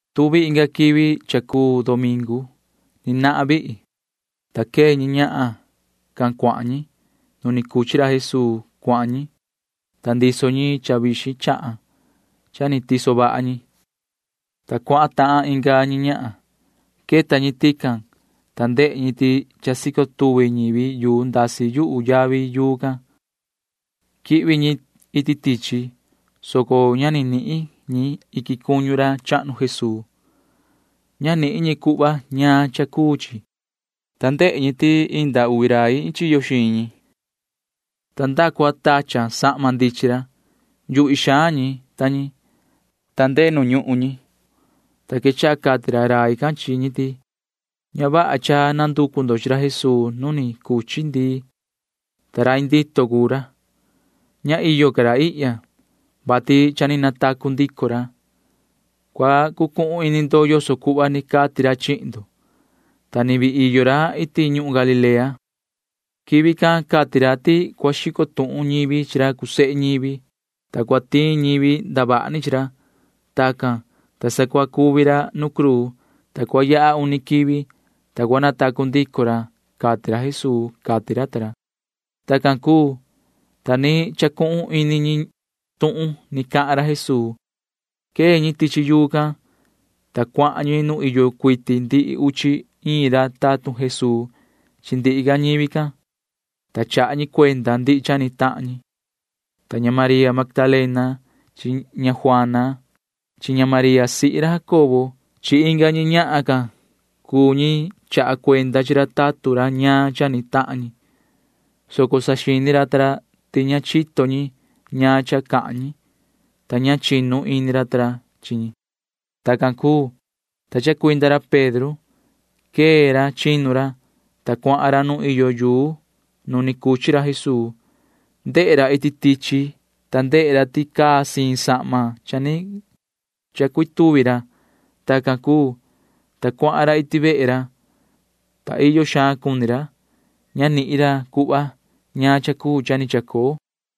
Tuvi inga quivi cha cuu domingu. Ni nahan vihi, ta quee ñi ñahan can cuahan ñi. Nu ni cuchi ra Jesuu cuahan ñi, ta ndiso ñi cha vixin chahan cha ni tiso vaha ñi, ta cuahan tahan inga ñi ñahan. Queta ñi tican, ta ndehe ñi ti cha sico tuvi ñivi yuu ndasi yuhu yavi yuu can. Quihvi ñi iti tichi, soco ña ni nihin ñi iquin cuñu ra chahnu Jesuu. Ña nihin ñi cuhva ñaan cha cuu chi, ta ndehe ñi ti indi uvi rai iin chiyo xiin ñi, ta nda cua tachan sahma ndichin ra. Yuhvi xaan ñi ta ñi, ta ndehe ñi nu ñuhun, ta quechaha cati ra rai can chi ñi ti: ―Ña vaha cha nanducu ndo chi ra Jesuu nu ni cuchi ndii, ta rai ndito cuu ra. Ña iyo ca ra ihya, vati cha ni natacu ndico ra. Cua cucuhun ini ndo yoso cuhva ni cati ra chihin ndo, ta ni vii iyo ra iti ñuhun Galilea. Quivi can cati ra ti cua xico tuhun ñivi chi ra cuu sehe ñivi, ta cua tiin ñivi ndavaha ni chi ra. Tacan, ta sa cua cuvi ra nu cruu, ta cua yaha uni quivi, ta cua natacu ndico ra, cati ra Jesuu ―cati ra ta ra. Tacan cuu, ta ni chacuhun ini ñi tuhun ni cahan ra Jesuu. Quee ñi tichi yuu can, ta cuahan ñi nu iyo cuiti ndihi uchi iin ra tatun Jesuu chi ndihi ca ñivi can, ta chaha ñi cuenda ndihi cha ni tahan ñi. Ta ña María Magdalena chi ña Juana chi ña María sihi ra Jacobo chi inga ñi ñahan can cuu ñi chaha cuenda chi ra tatun ra ñaan cha ni tahan ñi, soco saxini ra ta ra ti ña chito ñi ñaan cha cahan ñi, ta ña chinu ini ra ta ra chi ñi. Tacan cuu, ta chacuinda ra Pedro. Quee ra chinu ra, ta cuahan ra nu iyo yuu nu ni cuchi ra Jesuu. Ndehe ra iti tichi, ta ndehe ra ti caa siin sahma cha ni chacuituvi ra. Tacan cuu, ta cuahan ra iti vehe ra, ta iyo xaan cuni ra. Ña nihin ra cuhva ñaan cha cuu cha ni chacoo.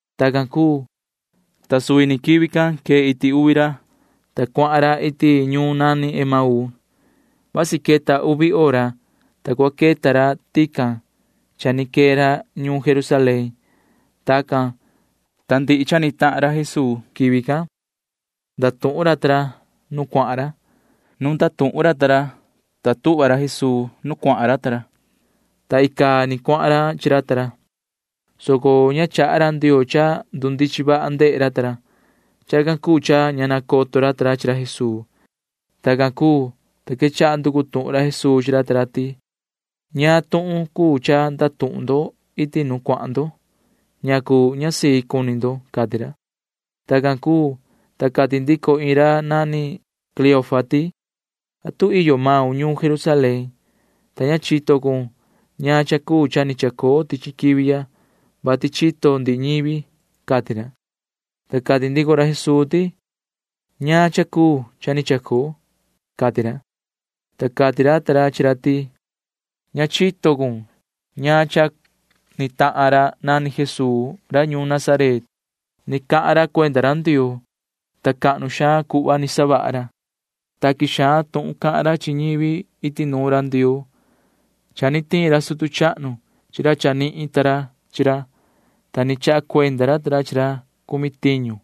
Tacan cuu, ta ini quivi can quee iti uvi ra, ta cuahan ra iti ñuun nani Emauu. Vasi queta uvi hora, ta cua queta ra tican cha ni quee ra ñuun Jerusalén. Tacan, ta ndihi tuhun cha ni tahan ra Jesuu quivi can ndatuhun ra ta ra nu cuahan ra. Nu ni ndatuhun ra chi tahan ra, ta suvi ra Jesuu tuhva nu cuahan ra ta ra, ta icaa ni cuahan ra chi ra ta ra, soco ña chaha ra Ndioo cha ndundichin vaha ndehe ra ta ra. Chacan cuu cha ña nacoto ra ta ra chi ra Jesuu. Tacan cuu, ta quechaha nducu tuhun ra Jesuu chi ra ta ra ti: ―¿Ñaan tuhun cuu cha ndatuhun ndo iti nu cuahan ndo? ¿Ñacu ña sii cuni ndo? ―cati ra. Tacan cuu, ta cati ndico iin ra nani Cleofa ti: ―¿Atu iyo maun ñuun Jerusalén, ta ña chito cun ñaan cha cuu cha ni chacoo tichi quivi ya, vati chito ndihi ñivi? ―cati ra. Ta cati ndico ra Jesuu ti: ―¿Ñaan cha cuu cha ni chacoo? ―cati ra. Ta cati ra ta ra chi ra ti: ―Ña chito cun ñaan cha ni tahan ra nani Jesuu ra ñuun Nazaret. Ni cahan ra cuenda ra Ndioo, ta cahnu xaan cuhva ni savaha ra. Taqui xaan tuhun cahan ra chi ñivi iti nuun ra Ndioo. Cha ni tiin ra sutu chahnu chi ra chanihin ta ra chi ra, ta ni chaha cuenda ra ta ra chi ra chi ra cumi tiñu,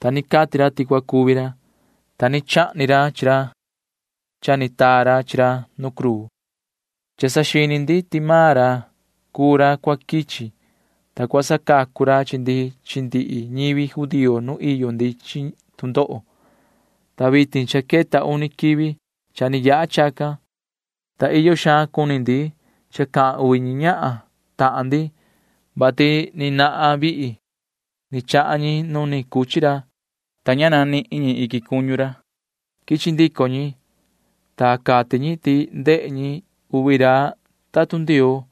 ta ni cati ra ti cua cuvi ra, ta ni chahni ra chi ra cha ni taa ra chi ra nu cruu. Cha saxini ndi ti maan ra cuu ra cua quichi, ta cua sacacu ra chi ndi chi ndihi ñivi judío nu iyo ndi chi tu ndoho, ta vitin cha queta uni quivi cha ni yaha chacan. Ta iyo xaan cuni ndi cha cahan uvi ñi ñahan tahan ndi, vati ni nahan vihi ni chahan ñi nu ni cuchi ra, ta ña nihin ñi iquin cuñu ra. Quichi ndico ñi, ta cati ñi ti ndehe ñi chi uvi ra tatun Ndioo,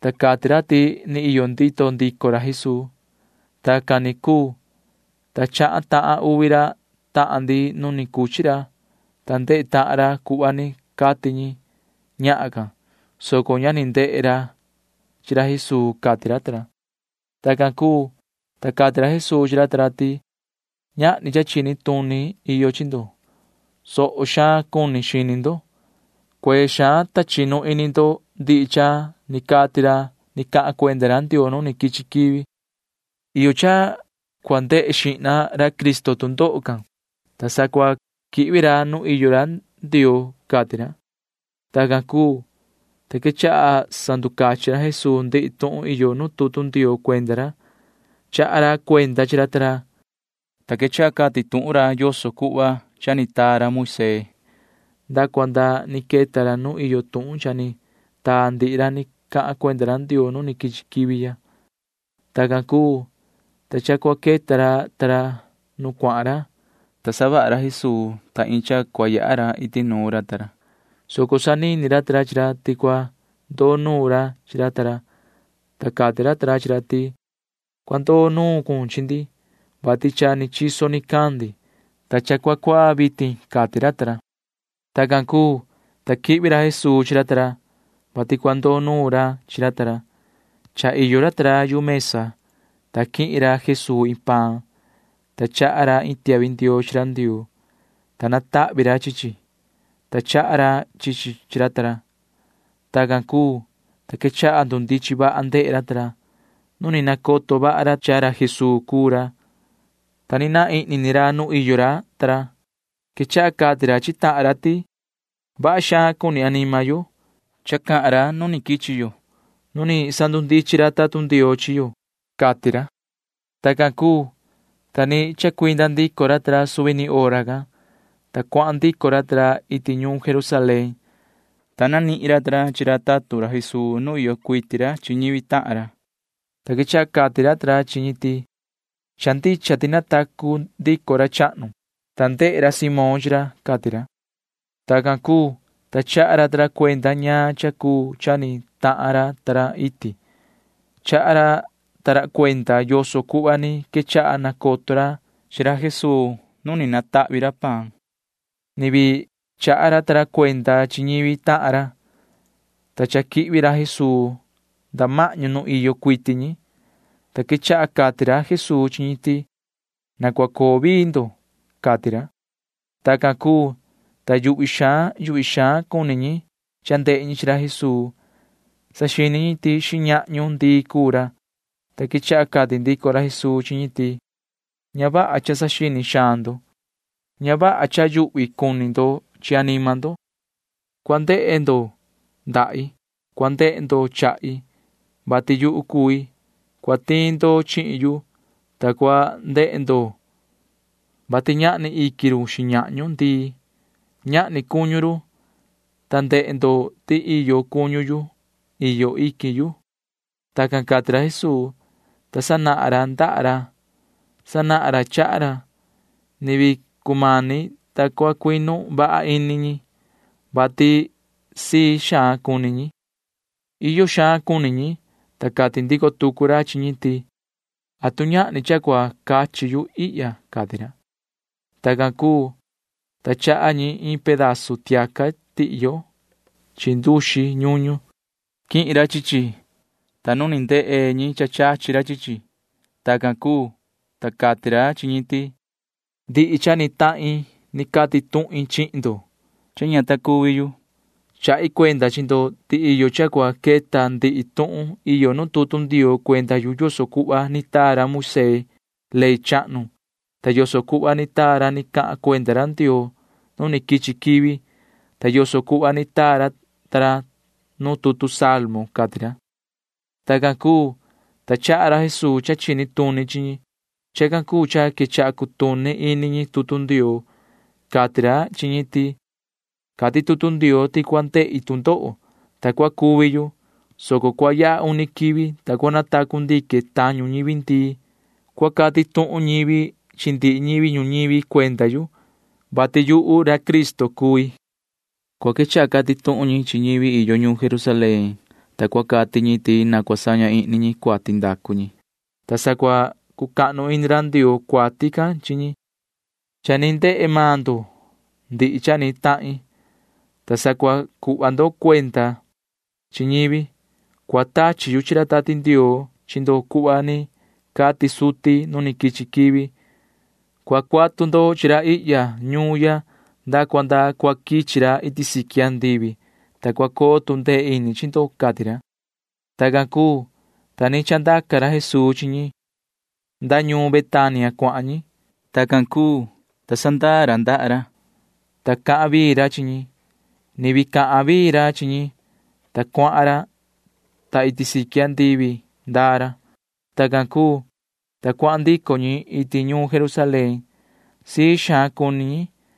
ta cati ra ti ni iyo ndito ndico ra Jesuu. Tacan ni cuu, ta chahan tahan uvi ra tahan ndi nu ni cuchi ra, ta ndehe tahan ra cuhva ni cati ñi ñahan can, soco ña ni ndehe ra chi ra Jesuu ―cati ra ta ra. Tacan cuu, ta cati ra Jesuu chi ra ta ra ti: ―Ñahni cha chini tuni iyo chi ndo. [Tondo xaan xini ndo.] Cuee xaan, ta chinu ini ndo ndihi cha ni cati ra ni cahan cuenda ra Ndioo nu ni quichi quivi. Iyo cha cua ndehe xihna ra Cristo tu ndoho can, ta sa cua quihvi ra nu iyo ra Ndioo ―cati ra. Tacan cuu, ta quechaha sanducachin ra Jesuu ndihi tuhun iyo nu tutu Ndioo cuenda ra. Chaha ra cuenda chi ra ta ra, ta quechaha cati tuhun ra yoso cuhva cha ni taa ra Moisee nda cua nda ni queta ra nu iyo tuhun cha ni taa ndihi ra ni cahan cuenda ra Ndioo nu ni quichi quivi ya. Tacan cuu, ta cha cua queta ra ta ra nu cuahan ra, ta savaha ra Jesuu ta iin cha cua yaha ra iti nuun ra ta ra, soco sanini ra ta ra chi ra ti cua ndoo nuun ra chi ra ta ra, ta cati ra ta ra chi ra ti: ―Cua ndoo nuun cun chi ndi, vati cha ni chiso nicandi, ta cua cuaa vitin ―cati ra ta ra. Tacan cuu, ta quihvi ra Jesuu chi ra ta ra, vati cua ndoo nuun ra chi ra ta ra. Cha iyo ra ta ra yu mesa, ta quihin ra Jesuu iin paan, ta chaha ra iin tiahvi ndioo chi ra Ndioo, ta natahvi ra chi chi, ta chaha ra chi chi chi ra ta ra. Tacan cuu, ta quechaha ndundichin vaha ndehe ra ta ra. Nu ni nacoto vaha ra cha ra Jesuu cuu ra, ta naan ihni ni ra nu iyo ra ta ra. Quechaha cati ra chi tahan ra ti: ―Vaha xaan cuni anima yo, ta cahan ra nu quichi yo nu ni sanducachin ra tutu Ndioo chi yo ―cati ra. Tacan cuu, ta ni chacuinda ndico ra ta ra suvi ni hora can, ta cuahan ndico ra ta ra iti ñuun Jerusalén, ta nihin ra ta ra chi ra tatun ra Jesuu nu iyo cuiti ra chi ñivi tahan ra, ta quechaha cati ra ta ra chi ñi ti: ―Cha ndicha ti natacu ndico ra chahnu, ta ndehe ra Simón chi ra ―cati ra. Tacan cuu, ta chaha ra ta ra cuenda ñaan cha cuu cha ni tahan ra ta ra iti. Chaha ra ta ra cuenda yoso cuhva ni quechaha nacoto ra chi ra Jesuu nu ni tahvi ra paan. Ni vii chaha ra ta ra cuenda chi ñivi tahan ra, ta cha quihvi ra Jesuu nda mahñu nu iyo cuiti ñi, ta quechaha cati ra Jesuu chi ñi ti: ―Na cua coo vii ndo ―cati ra. Tacan cuu, ta yuhvi xaan yuhvi xaan cuni ñi cha ndehe ñi chi ra Jesuu. Saxini ñi ti xiñahñu ndii cuu ra, ta quechaha cati ndico ra Jesuu chi ñi ti: ―Ña vaha cha saxini xaan ndo. Ña vaha cha yuhvi cuni ndo chi anima ndo. Cua ndehe ndo ndahi. Cua ndehe ndo chahi, vati yuhu cui. Cua tiin ndo chihin yu, ta cua ndehe ndo, vati ñahni iquin run xiñahñu ndii. Ñahni cuñu run, ta ndehe ndo ti iyo cuñu yu. Iyo iquin yu. Tacan cati ra Jesuu, ta sanahan ra ndaha ra. Sanahan ra chaha ra. Ni vii cumani, ta cua cuinu vaha ini ñi, vati sii xaan cuni ñi. Iyo xaan cuni ñi, ta cati ndico tucu ra chi ñi ti: ―¿Atu ñahni cha cua cachi yu ihya? ―cati ra. Tacan cuu, ta chaha ñi iin pedazu tiaca tihyo chi nduxi ñuñu. Quihin ra chi chi, ta nuun ni ndehe ñi chachi ra chi chi. Tacan cuu, ta cati ra chi ñi ti: ―Ndihi cha ni tahin ni cati tuhin chihin ndo, ta ña ta cuvi yu. Chahi cuenda chi ndo ti iyo cha cua queta ndihi tuhun iyo nu tutu Ndioo cuenda yu yoso cuhva ni taa ra Moisee ley chahnu ta yoso cuhva ni taa ra ni cahan cuenda ra Ndioo nu ni quichi quivi ta yoso cuhva ni taa ra ta ra nu tutu Salmo ―cati ra. Tacan cuu, ta chaha ra Jesuu cha chini tuni chi ñi. Chacan cuu cha quechaha cutuni ini ñi tutu Ndioo. Cati ra chi ñi ti: ―Cati tutu Ndioo ti cua ndehi tu ndoho, ta cua cuvi yu, soco cua yaha uni quivi, ta cua natacu ndique tañu ñivi ndii. Cua cati tuhun ñivi chi ndihi ñivi ñuñivi cuenda yu, vati yuhu ra Cristo cui. Cua quechaha cati tuhun ñi chi ñivi iyo ñuun Jerusalén, ta cua cati ñi ti na cua saña ihni ñi cuati ndacu ñi, ta sa cua cucahnu ini ra Ndioo cuati can chi ñi. Cha ni ndehe maan ndo ndihi cha ni tahin, ta sa cua cuhva ndo cuenda chi ñivi. Cua tachi yu chi ra Tati Ndioo chi ndo cuhva ni cati suti nu ni quichi quivi. Cua cuatu ndo chi ra ihya ñuun ya nda cua nda cua quichi ra iti siqui andivi, ta cua coo tu ndee ini chi ndo ―cati ra. Tacan cuu, ta ni chandaca ra Jesuu chi ñi. Nda ñuun Betania cuahan ñi. Tacan cuu, ta sandaa ra ndaha ra, ta cahan vii ra chi ñi. Ni vii cahan vii ra chi ñi, ta cuahan ra, ta iti siqui andivi ndaa ra. Tacan cuu, ta cuahan ndico ñi iti ñuun Jerusalén. Sii xaan cuni ñi,